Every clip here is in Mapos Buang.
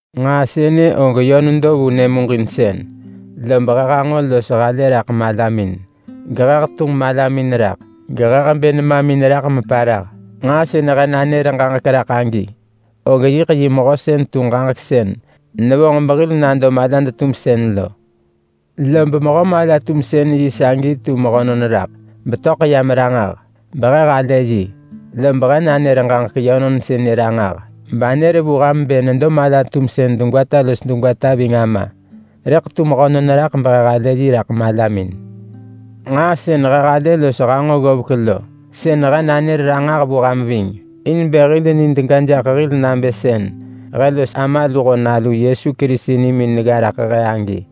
Nġaa sënë og yö nedo vu nyëmuġinsën. Lob he hanġo los halë raḳ malamin. Gehe hetunġ malamin raḳ gehe hebë nemamin raḳ meparah. Nġaa sën he nanër ġaġek raḳ agi, og yiḳ yi mehö sën tu Ġaġek sën nevonġ behil nado malad-tumsën lo. Lob Mehö mala-tumsën-yi sagi tu mehönon raḳ, betöḳ yam ranġah, behe halë yi. Lob he nanër ġaġek yönon sënë ranġah, banër vu ham bë nedo mala-tumsën degwata los degwata ving Ama. Rëḳ tu mehönon raḳ behe halë yi raḳ malamin. Nġaa sën he halë los hanġo ggovek lo, sën he nanër ranġah vu ham ving, in bë hil nid ga jaḳ hil nabë sën he los Ama luho Nalu Yesu Kerisi nimin negga raḳ he agi.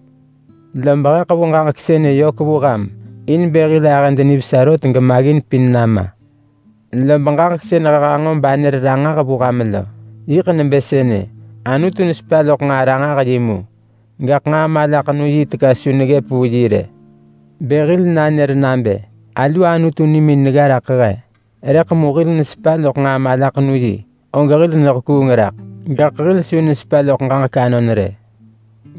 Lob he ḳevu ġaġek sënë yök vu ham in bë hil ahëd nivesa rot gemaggin pin nama. Lob ġaġek sën he hanġo banër ranġah vu ham lo, yiḳ nebë sënë: Anutu nesepa loḳ nġaa ranġah-yi mu, gaḳ nġaa malaḳenu-yi teka su neggëp vu yi rë. Bë hil nanër nabë, “Alu Anutu nimin negga raḳ he”, rëḳ mu hil nesepa loḳ nġaa malaḳenu-yi, og hil nehekuung raḳ, gaḳ hil su nesepa loḳ ġaġek anon rë.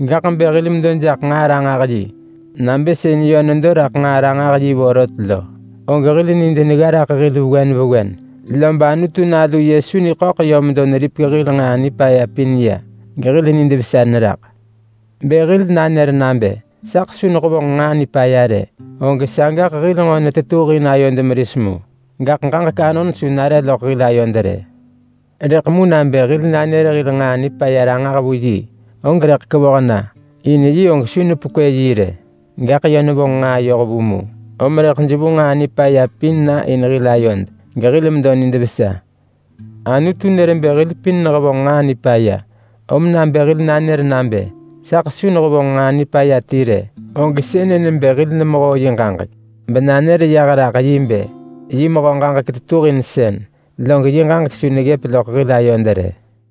Gaḳ bë hil medo jaḳ nġaa ranġah-yi nabë sën yö nedo raḳ nġaa ranġah-yi vorot lo, og hil nid negga raḳ hil vewen vewen, lob Anutu Nalu Yesu niḳöḳ yö medo neripek hil nġaa nipaya pin ya, gehil nid vesa neraḳ. Bë hil nanër nabë, “Saḳ su nehevonġ nġaa nipaya rë”, og sagaḳ hil nġo netetuhin ayod meris mu, gaḳ ġaġek anon su nare loḳ hil ayod rë. Rëḳ mu nabë hil nanër hil nġaa nipaya ranġah vu yi, og rëḳ kevoh na, in yi og su nepekwë yi rë. Gaḳ yö nevonġ nġaa yohvu mu, om rëḳ jevu nġaa nipaya pin na in hil ayod gehil medo nid vesa. Anutu nër bë hil pin nehevonġ nġaa nipaya, om nabë hil nanër nabë, “Saḳ su nehevonġ nġaa nipaya ti rë”, og sënë nebë hil nemehoo yi ġaġek, benanër yah raḳ yi bë yi mehö ġaġek tetuhinsën, log yi ġaġek su neggëp loḳ hil ayod rë.